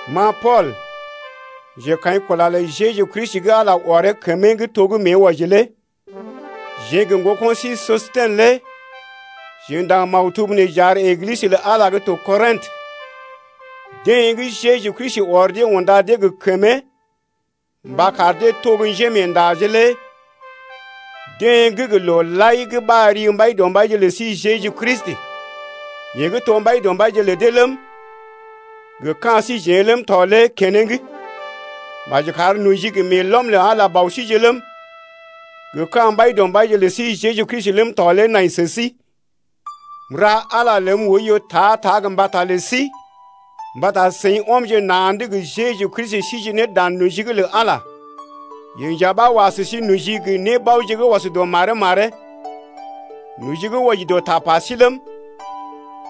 Ma Pool, njekaḭkula lə Jeju Kristi gə́ Ala ɔree kəmee’g to gə́ mée wɔji lé jeḛ gə ŋgoko̰ sí Sostɛnə lé jeḛ ndaŋg maktub nee j’ar Eglisə lə Ala gə́ to Kɔrḭtə, deḛ gə́ Jeju Kristi ɔr dee unda dee gə kəmee mba kar dee to njémeendaje lé deḛ gə́ gə loo lai ɓar ri Mbaidɔmbaije lə sí Jeju Kristi, yeḛ gə́ to Mbaidɔmbaije lə dee ləm, gə ka̰ síjeḛ ləm tɔ lé keneŋ. Maji kar noji gə meelɔm lə Ala lé Bɔ síje ləm, gə ka̰ Mbaidɔmbaije lə sí Jeju Kristi ləm tɔ lé nai sə sí. M’ra Ala ləm oiyo ta-ta gə mbata lə sí mbata seḭ ɔmje na̰’d gə Jeju Kristi síje ne dan noji’g lə Ala. Yeḛ nja ɓa wa sə sí noji gə nébaoje gə́ ɔs dɔ maree-maree, noji gə́ wɔji dɔ tapa sí ləm,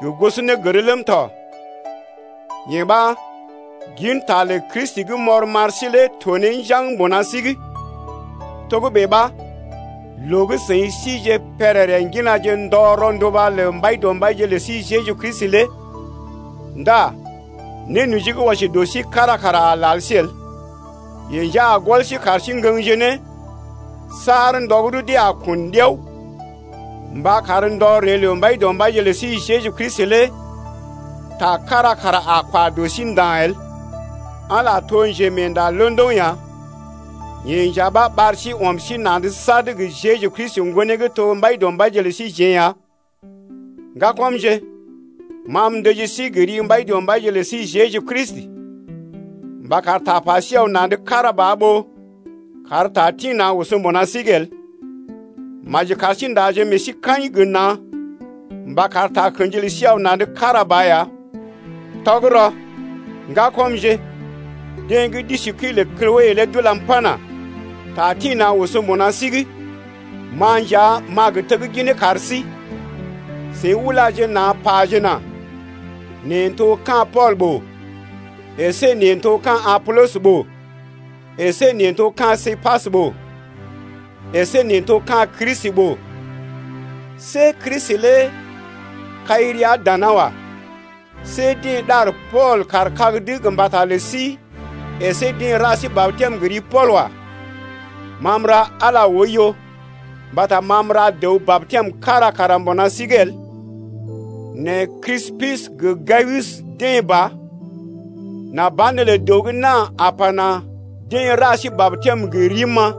gə gosonégər ləm tɔ. Yee ɓa, ginta lə Kristi gə́ m’ɔr m’ar sí lé to ne njaŋg mbuna sí’g. Togə́bè ɓa, loo gə́ seḭ sije pèrèrè ŋginaje ndɔ rɔnduba lə Mbaidɔmbaije lə sí Jeju Kristi lé ndá nénoji gə́ wɔji dɔ sí kára kara lal sí el. Yeḛ nja a gɔl sí kar sí ŋgəŋje ne, saar ndɔ gə́ rudee a kun ɗiao, mba kar ndɔ ree lə Mbaidɔmbaije lə sí Jeju Kristi lé ta kára kara a kwa dɔ sí nda̰ el. Ala to njemeenda londoŋ ya, yeḛ nja ɓa ɓar sí ɔm sí na̰’d sad gə Jeju Kristi Ŋgonee gə́ to Mbaidɔmbaije lə síjeḛ ya. Ŋgakɔmje, ma m’ndəji sí gə ri Mbaidɔmbaije lə sí Jeju Kristi mba kar tapa sí aw na̰’d kára ba ɓó kar ta tḭ-na̰ oso mbuna sí’g el. Maji kar sí ndaje meḛ sí kaḭ gə na̰ mba kar takə̰ji lə sí aw na̰’d kára ba ya. Tɔgərɔ, ŋgakɔmje, deḛ gə́ d’isi kəi lə Kloe lé d’ulam pana: Ta tḭ-na̰ oso mbuna sí’g. Ma nja m’a gə tegginee kar sí, seḭ ulaje na̰ pajena: Neḛ n’to ka̰ Pool ɓòo əsé neḛ n’to ka̰ Apolɔs ɓòo əsé neḛ n’to ka̰ Képas ɓòo əsé neḛ n’to ka̰ Kristi ɓòo. See Kristi lé kai rəa dana wa. See dee ɗar Pool kaar kag’d gə mbata lə sí əsé deḛ ra sí batɛm gə ri Pool wa. Ma m’ra Ala oiyo mbata ma m’ra dəw batɛm kára kara mbuna sí’g el nɛ Krispus gə Gayus ɓa. Nà banelə dəw gə́ na̰ a pana: Deḛ ra sí batɛm gə rim-ma.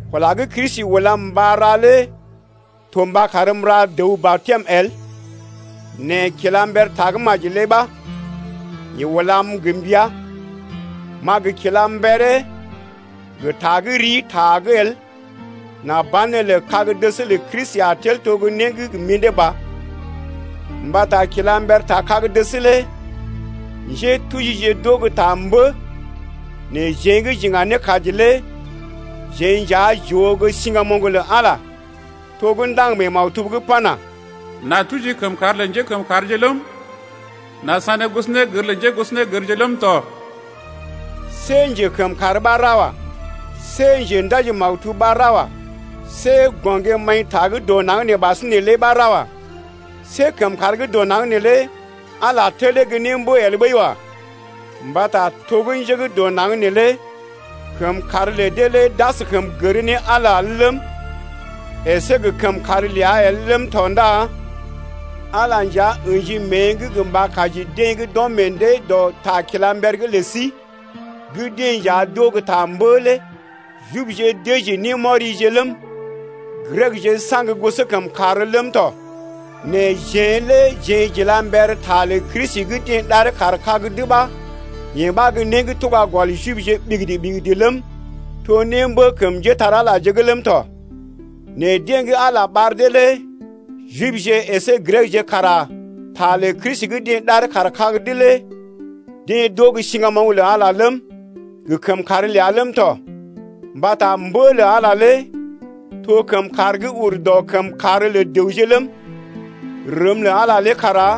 Kula gə́ Kristi ulam mba ra lé to mba karm m’ra dəw batɛm el, nɛ kila mber tagə́maji lé ɓa, yeḛ ulam gə mbəa, m’a gə kila mberee gə ta gə́ rii ta’g el nà banelə kag-dəs lə Kristi a tel to né gə́ gə mḭdé ba. Mbata kila mber ta kag-dəs lé njétujije d’oo gə́ ta mbə nɛ jeḛ gə́ j’iŋga ne kaji lé jeḛ nja j’oo gə́ siŋgamoŋ lə Ala lé. To gə́ ndaŋg mee maktub’g pana: N’a tuji kəmkàr lə njékəmkàrje ləm, N’a sané gosonégər lə njégosonégərje ləm tɔ. See njekəmkàr ɓa ra wa. See njendaji-maktub ɓa ra wa. See gɔŋgé-maḭta gə́ dɔ naŋg nee ɓasinè lé ɓa ra wa. See kəmkàr gə́ dɔ naŋg neelé Ala telee gə́ némbə el ɓəi wa. Mbata to gə́ njé gə́ dɔ naŋg neelé kəmkàr lə dee lé d’askəm gər ne Ala el ləm, əsé gə kəmkàr ləa el ləm tɔ ndá Ala lé nja ə̰ji mée’g gə mba kaji deḛ gə́ d’ɔm meḛ dee dɔ ta kila mber’g lə sí gə́ dee nja d’oo gə́ ta mbə lé. Jibje dəji némɔrije ləm, Grekje saŋg gosɔkəmkàr ləm tɔ. Nɛ jeḛ lé jeḛ j’ila mber ta lə Kristi gə́ deḛ ɗaree kaar kag’d ɓa. Yee ɓa gə́ né gə́ tuga gɔl Jibje ɓigidi-ɓigidi ləm, to gə́ némbə kəm njépole-magəje’g ləm tɔ. Nɛ deḛ gə́ Ala lé ɓar dee lé Jibje əsé Grekje kara ta lə Kristi gə́ deḛ ɗaree kaar kag’d lé deḛ d’oo gə́ siŋgamoŋ lə Ala lé ləm, gə kəmkàr ləa ləm tɔ. Mbata mbə lə Ala lé to kəmkàr gə́ ur dɔ kəmkàr lə dəwje ləm, rəm lə Ala lé kara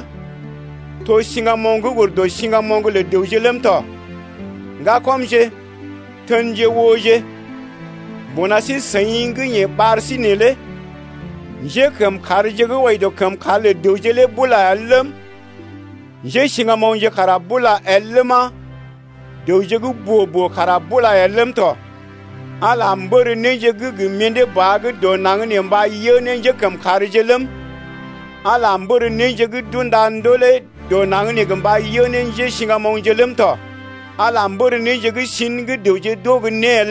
to siŋgamoŋ gə́ ur dɔ siŋgamoŋ lə dəwje ləm tɔ. Ŋgakɔmje, tenje ooje, mbuna sí-seḭ gə́ yeḛ ɓar sí neelé njékəmkàrje gə́ wɔji dɔ kəmkàr lə dəwje lé el ləm, njésiŋgamoŋje kara bula el ləma, dəwje gə́ boo-boo kara bula el ləm tɔ. Ala mbər néje gə́ gə mḭdé ba gə́ dɔ naŋg nee mba yə ne njékəmkàrje ləm, Ala mbər néje gə́ d’unda ndolè dɔ naŋg nee mba yə ne njésiŋgamoŋje ləm tɔ. Ala mbər néje gə́ sḭ gə́ dəwje d’oo gə́ né el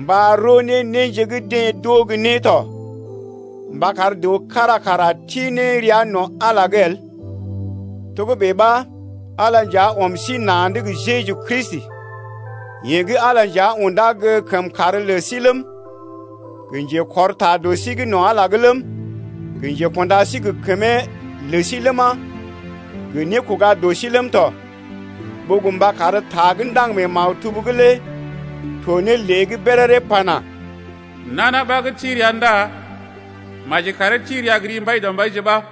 mba roo ne néje gə́ deḛ d’oo gə́ né tɔ mba kar dəw kára kara ti ne rəa no̰ Ala’g lé el. Togə́bè ɓa Ala nja ɔm sí na̰’d gə Jeju Kristi, yeḛ gə́ Ala nja undá gə́ kəmkàr lə sí ləm, gə njekɔr ta dɔ sí no̰ Ala’g lé ləm, gə nékunda sí gə kəmee lə sí ləma, gə nékoga dɔ sí ləm tɔ, ɓó gə mba kar ta gə́ ndaŋg mee maktub’g lé to ne lée’g béréré pana: Nana ɓa gə́ ti rəa ndá maji karee ti rəa gə ri Mbaidɔmbaije ɓa.